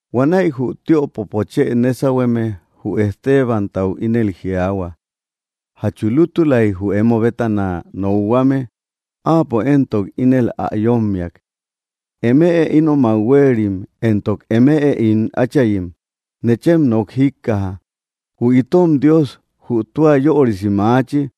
Huanäi jü tiöpopo chë nésauhueme jü Estebantau ínel jiaahua: —¿Jatchu lútulai jü emo bétana nokhuame? Áapo éntok, ínel ä yómmiak: —Eme ínomak huéerim, éntok eme ín áchayim, nechem nok jíkkaja. Jü itom Dios, jü tua yörisi maachi,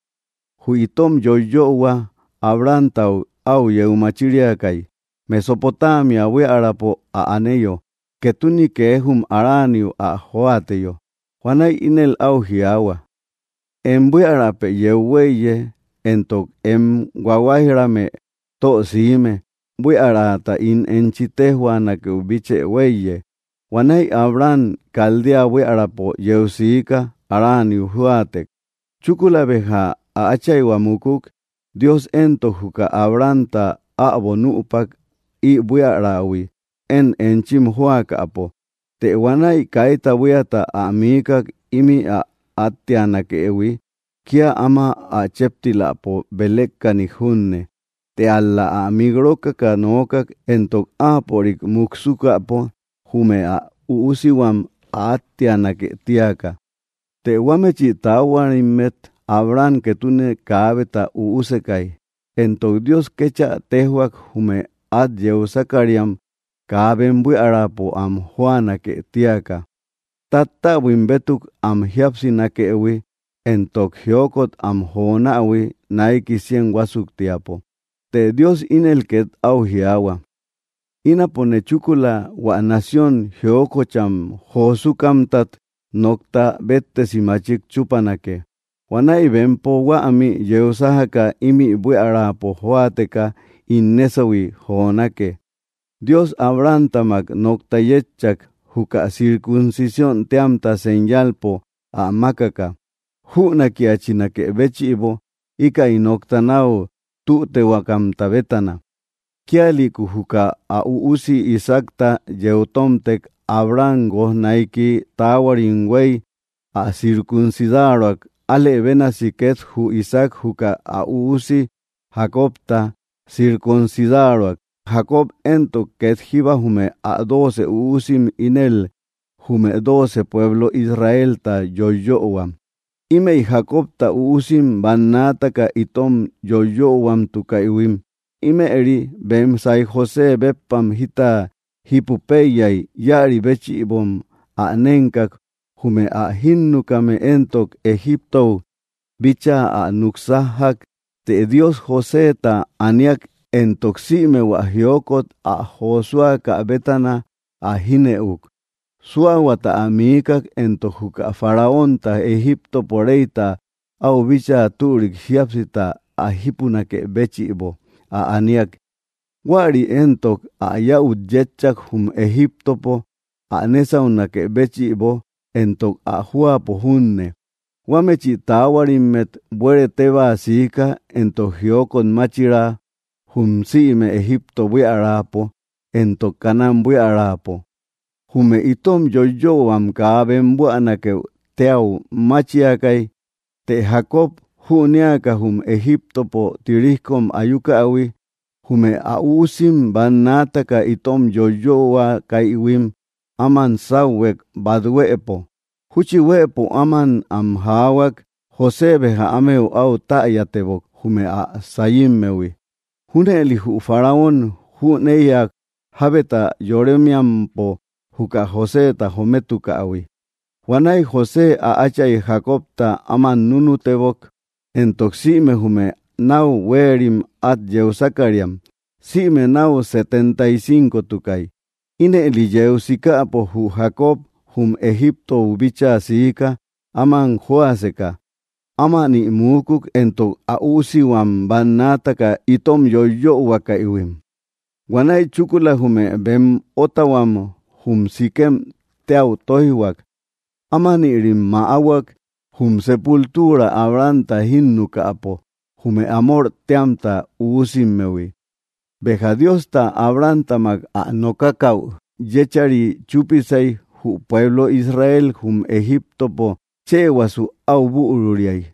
jü itom yoyöhua Abrahamtau au yeu machíriakai Mesopotamia buíaräpo áa aneyo, ketune kee jum Haraniu ä jóateyo. Huanäi ínel au jiaahua: “Em buíarapë yeu huéiye, éntok em huáhuaijrame tösime, buíarata ín enchi téjhuanakeu bíchë huéiye.” Huanäi Abraham Caldea buíaräpo yeu sika Haraniu jóatek. Chúkula béja ä áchaihua múkuk. Dios éntok, juka Abrahamta äbo nüpak ï buíarahui én enchim jóakäpo. Të huanäi kaita buíata ä miíkak ímï ä átteanakëhui, kía áma ä chéptiläpo belékkanik junne Të ál‑la ä mik rókaka nookak, éntok áapörik muksukäpo jume ä üusihuam ä átteanake tíaka. Të huámechi taahuarimmet Abraham ketune kaabeta üusekai. Éntok Dios kéchä téjhuak jume at yeu sákariam kaa bem buíaräpo am jóanake tíaka, tattäbuim bétuk am jíapsinakëhui, éntok jiókot am jonähui naiki cien huásuktiapo. Të Dios ínel ket au jiaahua: “Ínapone chúkula hua nación jiokocham josúkamtat nokta béttesi machik chúpanake Huanäi bempo huämi yeu sájaka ímï buíaräpo jóateka ín nésauhui jonake.” Dios Abrahamtamak nokta yetchak, juka circuncisión téamta señalpo ä mákaka, jünákiachinakë béchïbo íkäi nokta nau tütehuakamta bétana. Kíalïku juka ä üusi Isaacta yeu tómtek, Abraham guojnaiki taáhuarim huei ä circuncidaroak. Álë bénasi ket jü Isaac juka ä üusi Jacobta circuncidaroak. Jacob éntok, ket jíba jume ä dóoce üusim ínel jume dóoce pueblo Israelta yoiyöhuam. ’Ímëi Jacobta üusim, bannaataka itom yoiyöhuamtukaïhuim, ímëri bem saiy José béppam jita jípupeiyay íäri béchïbom ä nénkak. Jume ä jínukame éntok, Egiptou bíchaa ä nuksájjak. Të Dios Joseta aníak, éntok sïme hua jiókot ä josúakä bétana ä jínëuk. Súahuata ä miíkak, éntok juka Faraonta, Egíptopo reyta, au bíchaa türik jíapsita ä jípunakë béchïbo ä aníak. Huäri éntok ä yäut yétchak jum Egíptopo ä nésaunakë béchïbo, éntok ä jóapo junne. ’Huámechi taáhuarimmet buere tébaa siika éntok jiókot máchira jum sïme Egipto buíaräpo éntok Canaán buiärapo. Jume itom yoiyöhuam kaa bem buänakeu téu máchiakay. Të Jacob jünéaka jum Egiptopo tirijkom ayukähui, jume ä üusim bannaataka itom yoiyöhuakäïhuim áman sáuhuek bát huëpo. Júchi huëpo áman am jaahuak, José béja ámeu au täyatebok jume ä sayímmehui. Júnëli jü Faraón jüneïak jábeta yoremiampo juka Joseta jometukähui. Huanäi José ä áchay Jacobta áman núnutebok éntok sïme jume nau huérim at yeu sákariam, sïme náu setenta y cincotukay. Ínëli yeu sikäpo jü Jacob jum Egiptou bíchaa siika áman jóaseka. Ámani muúkuk éntok ä üúsihuam bannaataka itom yoiyöhuakäïhuim. Huanäi chúkula jume bem ótahuam jum Siquem téäu tóijhuak. Ámanïrim mäáhuak jum sépultura Abrahamta jínnukäpo jume Hamor téamta üusimmehui. ’Béja Diosta Abrahamtamak ä nokakau yechari chúpisei, jü pueblo Israel jum Egíptopo chëhuasu au büruriai.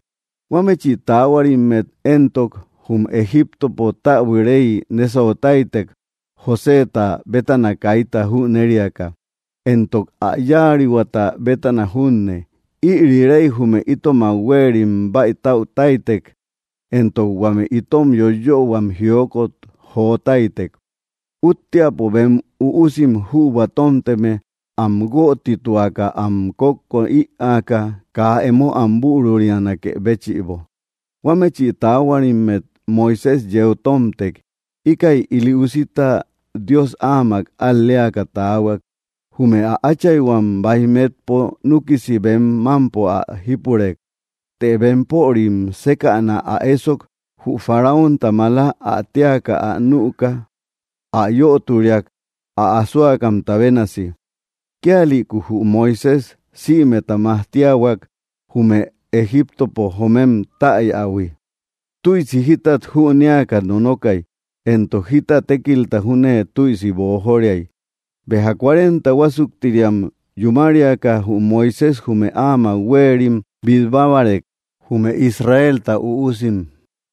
Huámechi taáhuarimmet éntok, jum Egíptopo täbui rey nésautáitek Joséeta bétana kaita jünériaka, éntok ä yáarihuata bétana junne. Ïri rey jume itomak huérim bäitautáitek, éntok huame itom yoiyöhuam jiókot jotáitek, útteapo bem üusim jübua tómteme am guötituaka am kókko ïaaka, kaa emo am bürurianakë béchïbo. Huámechi taáhuarimmet Moisés yeu tómtek. Íkäi ili úsita Dios ámak al‑léaka taahuak. Jume ä áchaihuam baij metpo núkisi bem mampo ä jípurek. Të bempörim sékäna ä ésok jü Faraonta malá ä téaka ä nüka, ä yöturiak ä asóakamta bénasi. Kíalïku jü Moisés sïmeta majtíahuak jume Egíptopo jomem täyähui. Tüisi jítat jünéaka nonokai, éntok jita tékilta júne tüisi boojóriai. ’Béja cuarenta huásuktiriam yúmariaka jü Moisés jume áamak huérim bitbábarek, jume Israelta üusim.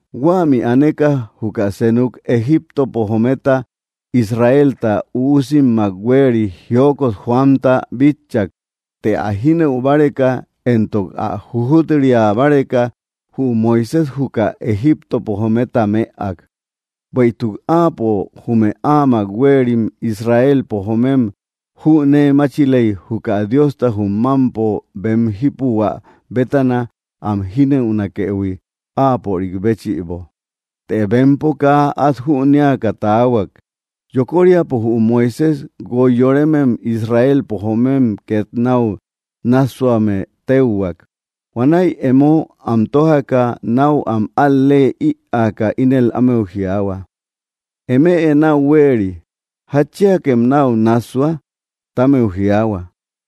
Huämi aneka juka senuk Egíptopo jometa Israelta üusimmak huéeri jiókot joamta bitchak. Të ä jínëu báreka, éntok ä jujut‑ria báreka, jü Moisés juka Egíptopo jometa mëak. Bueïtuk áapo jume áamak huérim Israelpo joomem jünéemáchilei juka Diosta jum mampo bem jípuhuä bétana am jínëunakëhui áapörik béchïbo. Të bempo kaa at jünéaka taahuak. Yokóriapo jü Moisés guoi yorémem Israelpo joomem ket nau nássuame téuhuak. Huanäi emo am tójaka, nau am al‑leë ïaaka, ínel ámeu jiaahua: “Eme nau huéeri; ¿jatchíakem nau nassua?”, ti ámeu jiaahua.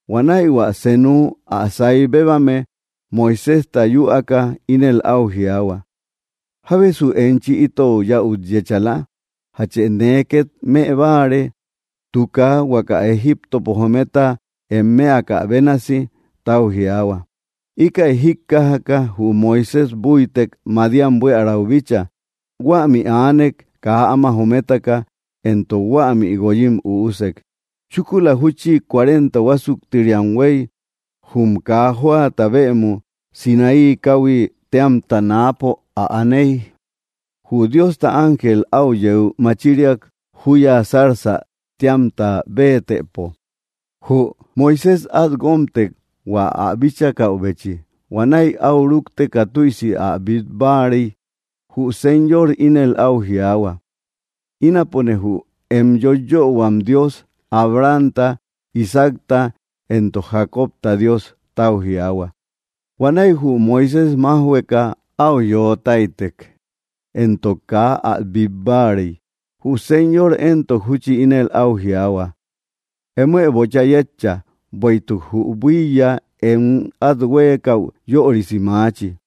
Huanäi hua seenu ä sai bébame Moiséjta yüaaka ínel au jiaahua: “¿Jábesu enchi itou yäut yéchala? ¿Játchë nee ket më báare, tuuka huaka Egiptopo jometa em mëakä bénasi?”, tau jiaahua. Íkäi jíkkajaka jü Moisés búitek Madián buíarau bícha. Huämi aanek kaa áma jométaka, éntok huämi guoyim üúsek. ’Chúkula júchi cuarenta huásuktiriam huéy, jum kaa jóata bëmu Sinaí káuhui téamta náapo ä aney, jü Diosta ángel áu yeu machiriak juya zarzä téamta béetëpo. Jü Moisés at guómtek hua ä bíchakäubechi. Huanäi au rúkteka tüisi ä bít báarey, jü Señor ínel au jiaahua: “Ínapone jü em yoiyöhuam Dios, Abrahamta, Isaacta, éntok Jacobta Dios”, tau jiaahua. Huanäi jü Moisés májhueka au yöo táitek, éntok kaa ä bít báarey. Jü Señor éntok, júchi ínel au jiaahua: “Emoë bocha yétcha, bueïtuk jü buíya em at huéekäu yörisi maachi.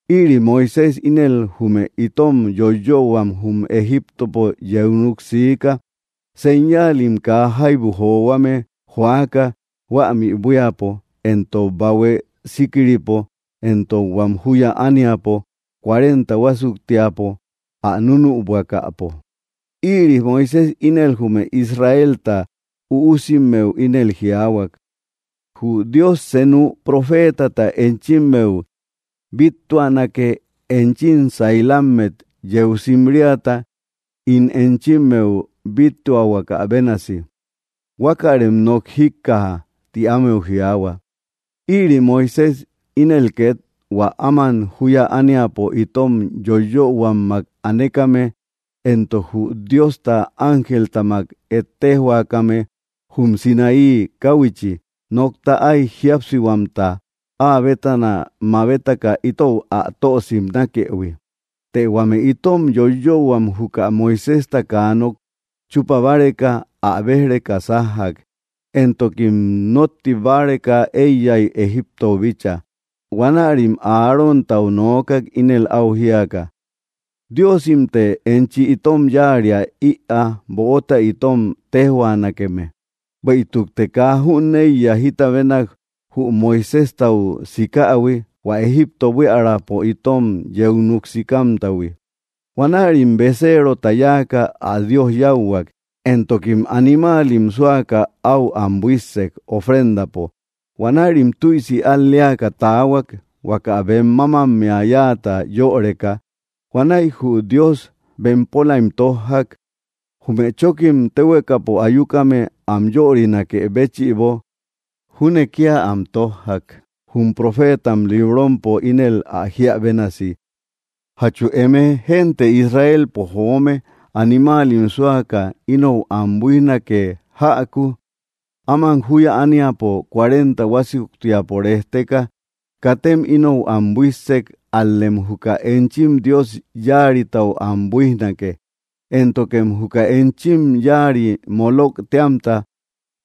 Ïri Moisés ínel jume itom yoiyöhuam jum Egíptopo yeu núk siika, señaalim kaa jaibu johuame joaka huämi buíapo, éntok Mar Rojopo, éntok huám júya ániapo, cuarenta huásuktiapo ä núnübuakäpo. Ïri Moisés ínel jume Israelta üusimmeu ínel jiáhuak: “Jü Dios senu profeetata enchimmeu bíttuanake enchim sailammet yeu simriata, ín enchimmeu bíttuahuakä bénasi. Huákärem nok jíkkaja”, ti ámeu jiaahua. Ïri Moisés ínel ket hua áman júya ániapo itom yoiyöhuammak anekame, éntok jü Diosta ángeltamak ettejhuakäme jum Sinaí káhuichi, nokta áy jíapsihuamta áa bétana mabetaka itou ä tö simnakëhui. ’Të huame itom yoiyöhuam juka Moiséjta kaa nok chupa báreka ä béj‑reka sájjak, éntokim notti báreka eiyai Egiptou bícha. Huanärim Aróntau noókak ínel au jíaka: “Diosimte enchi itom yáaria ïaa böota itom téjhuanakeme, bueïtukte kaa jüneiya jita bénak jü Moiséjtau sikähui, hua Egipto buíaräpo itom yeu nuksikámtahui.” Huanärim beceerota yáaka ä dios yáuhuak, éntokim animaalim súaka áu am buíssek, ofrendapo. Huanärim tüisi al‑leaka taahuak huaka bem mámammea yáata yöreka. Huanäi jü Dios bempólaim tójjak. Jume chókkim téhuekapo ayúkame am yörinakë béchïbo júne kíal am tójjak, jum profétam librompo ínel ä jiä bénasi: ¿Jatchu eme, génte Israelpo joome, animáalim súaka inou am buíjnake jäku áman juya ániapo cuarenta huásuktiapo rejteka? Katem inou am buísse, ál‑lem juka enchim dios yáaritau am buíjnake, éntokem juka enchim yáari Molók téamta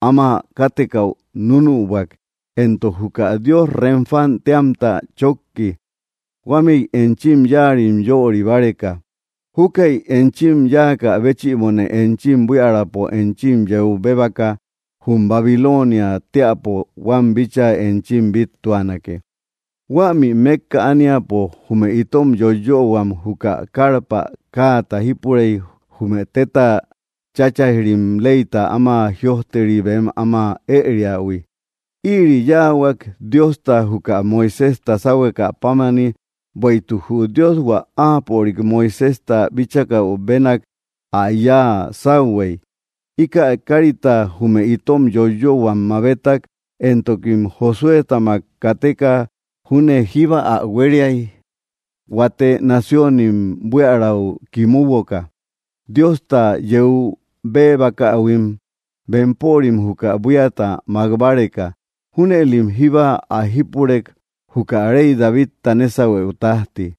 áma kátekäu núnübuak, éntok juka dios Renfán téamta chokki, huámëi enchim yáarim yöri báreka. Júkäi enchim yáakä béchïbone enchim buíaräpo enchim yeu béebaka jum Babiloniä teäpo huám bíchaa enchim bíttuanake. ’Huämi mekka aniapo jume itom yoiyöhuam juka karpa káata jípurei jume tetta cháchaij‑rim leyta áma jïojteri bem áma ëriähui. Íiri yáahuak Diosta juka Moiséjta sáhuekä pámani bueïtuk jü Dios hua áapörik, Moiséjta, bíchakäu bénak ä yáa sáuhey. Íkä kárita jume itom yoiyöhuam mabétak, éntokim Josuétamak kateka júne jíba ä huériai huate naciónim buíarau kimuboka, Diosta yeu béebakähuim bempörim juka buíata mak báreka. Júnëlim jíba ä jípurek juka rey Davidta nésauhuëu tajti.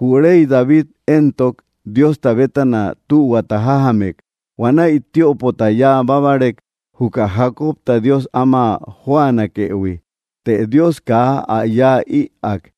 Jü rey David éntok, Diosta bétana tühuata jájamek. Huanäi tiöpota yáa bábarek juka Jacobta Dios áma jóanakëhui. Të Dios kaa ä yaä ïak.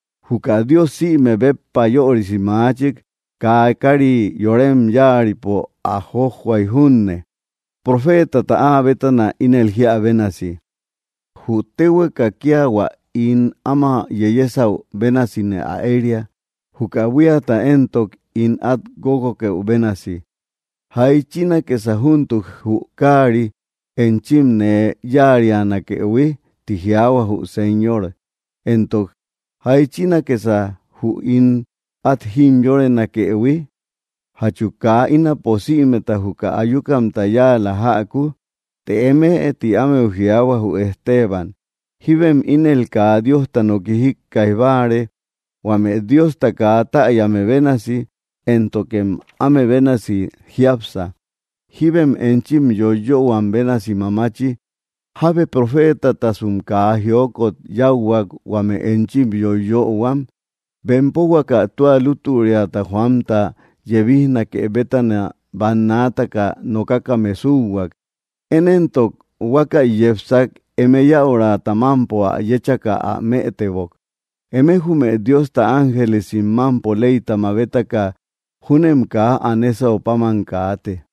Juka Dios sïme béppa yörisi machik kaa kari yorem yáaripo ä jójjoaï junne, profétata áa bétana ínel jiä bénasi: Jü téhueka kia hua ín áma yeyésäu bénasine ä eria, juka buíata éntok, ín at guóguokëu bénasi. ¿Jáichinakësa júntuk jü káari enchim nee yáarianakëhui?, ti jiaahua jü Señor, éntok, ¿jáichinakësa jü ín at jimyórenakëhui? ¿Jatchu kaa ínapo sïmeta juka ayúkamta yáala jäku? ’Të emëe —ti ámeu jiaahua jü Esteban— jíbem ínel kaa Diosta noki jíkkaij báare, huame Diosta kaa täyame bénasi, éntokem áme bénasi jiápsa. Jíbem enchim yoiyöhuam bénasi mamachi. ¿Jábe profétatasum kaa jiókot yáuhuak huame enchim yóyöhuam? Bempo huaka tua lútüriata joamta yebíjnake bétana bannaataka nokakame súuhuak. Én éntok, huákäi yepsak, eme yäurata mámpo ä yéchaka ä mëtebok. Eme jume Diosta ángelesim mampo leyta mabétaka júnem kaa ä nésau páman kaate.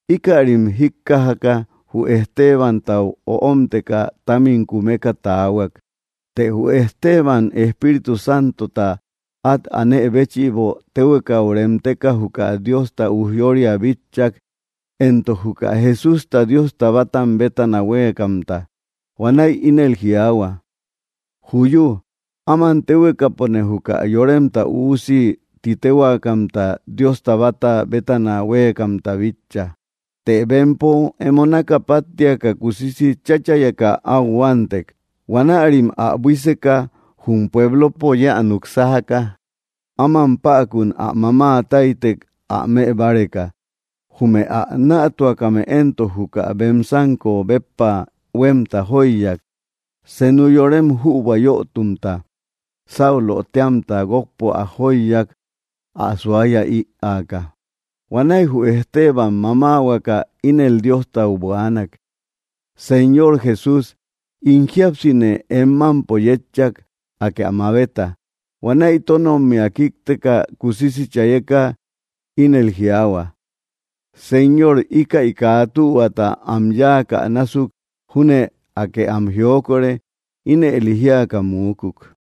Íkärim jíkkajaka, jü Estebantau öómteka támim kumeka tahuak. Të jü Esteban, Espíritu Santota at anë béchïbo, téhuekau reémtéka juka Diosta ujyóoria bitchak, éntok juka Jesústa Diosta bátam bétana huéekamta. Huanäi ínel jiaahua: —¡Juyú! Áman téhuekapone juka Yoremta Üusi titéhuaakamta Diosta bata bétana huéekamta bitcha. Të bempo emo naka páttiaka, kusisi cháchayeka áu huántek. Huaärim ä buíseka, jum puéblopo yeä nuksájaka, áman päkun ä mamáataitek ä mëbáreka. Jume ä nätuakame éntok, juka bem sanko béppa huemta jóiyak, senu yorem jübua yötumta, Saulo téamta, guokpo ä jóiyak ä suaya ïaaka. Huanäi jü Esteban mamáahuaka ínel Diostau buaanak: —Señor Jesús, ín jíapsine em mampo yétcha, aké ä mabeta. Huanäi tónommia kíkteka, kusisi chayeka ínel jiaahua: —Señor, íkäi kaa tühuata am yáakä násuk junne, Akë am jiokore. Ínëli jíaka muukuk.